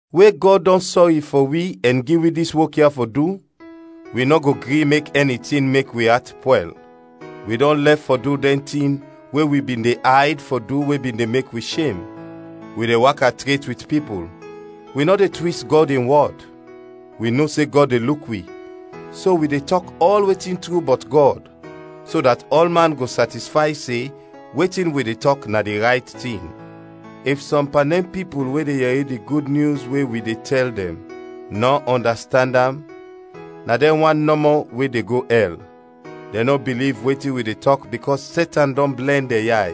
We Gɔd dɔn sɔri fɔ wi ɛn gi wi dis wok ya fɔ du, wi nɔ go gri mek ɛni tin mek wi at pwɛl. Wi dɔn lɛf fɔ du dɛn tin we wi bin de ayd fɔ du we bin de mek wi shem; wi de waka tret wit pipul, wi nɔ de twis Gɔd in wɔd; wi no se Gɔd de luk wi, so wi de tɔk ɔl wetin tru bɔt Gɔd, so dat ɔlman go satisfay se wetin wi de tɔk na di rayt tin. If sɔm pan dɛn pipul we de yɛri di Gud Nyus we wi de tɛl dɛn, nɔ ɔndastand am, na dɛn wan nɔmɔ we de go ɛl. Dɛn nɔ biliv wetin wi de tɔk bikɔs Setan dɔn blɛn dɛn yay.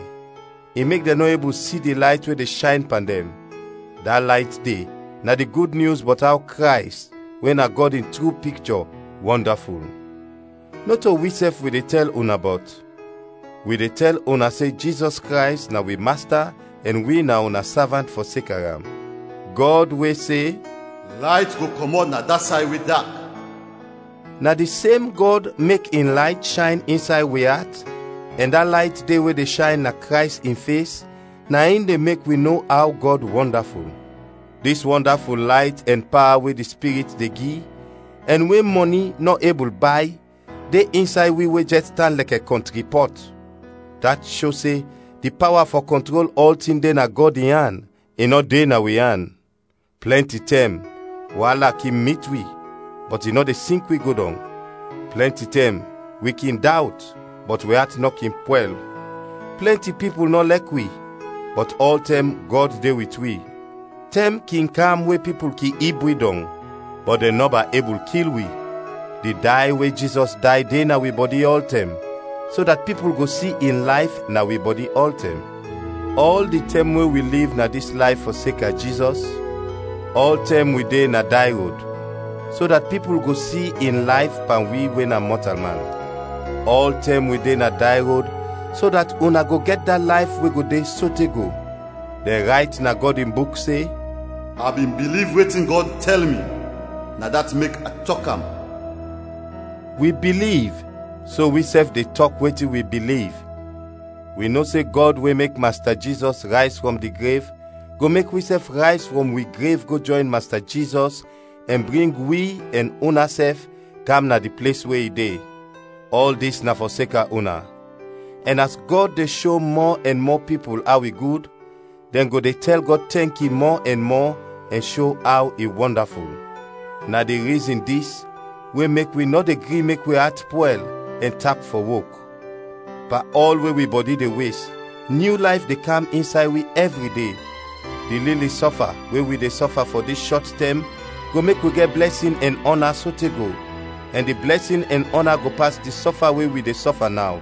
I mek dɛn nɔ ebul si di layt we de shayn pan dɛn; da layt de na di Gud Nyus bɔt aw Krays, we na Gɔd in tru pikchɔ, wɔndaful. Nɔto wisɛf wi de tɛl una bɔt; wi de tɛl una se Jizɔs Krays na wi Masta ɛn wi na una savant fɔseka am. Gɔd we se, “Layt go kɔmɔt na da say we dak!” na di sem Gɔd mek in layt shayn insay wi at ɛn da layt de we de shayn na Krays in fes, na in de mek wi no aw Gɔd wɔndaful. Dis wɔndaful layt ɛn pawa we di Spirit de gi, ɛn we mɔni nɔ ebul bay, de insay wi we jɛs tan lɛkɛ kɔntri pɔt. Dat sho se di pawa fɔ kɔntrol ɔltin de na Gɔd in an, i nɔ de na wi an. Plɛnti tɛm waala kin mit wi, bɔt i nɔ de sink wi go dɔng; plɛnti tɛm wi kin dawt, bɔt wi at nɔ kin pwɛl. Plɛnti pipul nɔ lɛk wi, bɔt ɔltɛm Gɔd de wit wi; tɛm kin kam we pipul kin ib wi dɔng, bɔt dɛn nɔba ebul kil wi. Di day we Jizɔs day de na wi bɔdi ɔltɛm, so dat pipul go si in layf na wi bɔdi ɔltɛm. Ɔl di tɛm we wi liv na dis layf fɔseka Jizɔs, ɔltɛm wi de na day rod, so dat pipul go si in layf pan wi we na mɔtalman. Ɔltɛm wi de na day rod so dat una go gɛt da layf we go de sote go. Dɛn rayt na Gɔd in Buk se, “A bin biliv wetin Gɔd tɛl mi, na dat mek a tɔk am.” Wi biliv, so wisɛf de tɔk wetin wi biliv. Wi no se Gɔd we mek Masta Jizɔs rayz frɔm di grev go mek wisɛf rayz frɔm wi grev go jɔyn Masta Jizɔs ɛn bring wi, ɛn unasɛf, kam na di ples we i de. Ɔl dis na fɔseka una; ɛn as Gɔd de sho mɔ ɛn mɔ pipul aw i gud, dɛn go de tɛl Gɔd tɛnki mɔ ɛn mɔ ɛn sho aw i wɔndaful. Na di rizin dis we mek wi nɔ de gri mek wi at pwɛl ɛn tap fɔ wok. Pan ɔl we wi bɔdi de wes, nyu layf de kam insay wi ɛvri de. Di lili sɔfa we wi de sɔfa fɔ dis shɔt tɛm go mek wi gɛt blɛsin ɛn ɔna sote go, ɛn di blɛsin ɛn ɔna go pas di sɔfa we wi de sɔfa naw,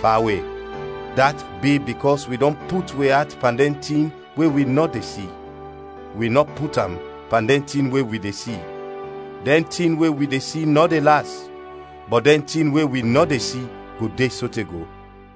fawe. Dat bi bikɔs wi dɔn put wi at pan dɛn tin we wi nɔ de si, wi nɔ put am pan dɛn tin we wi de si. Dɛn tin we wi de si nɔ de las, bɔt dɛn tin we wi nɔ de si go de sote go.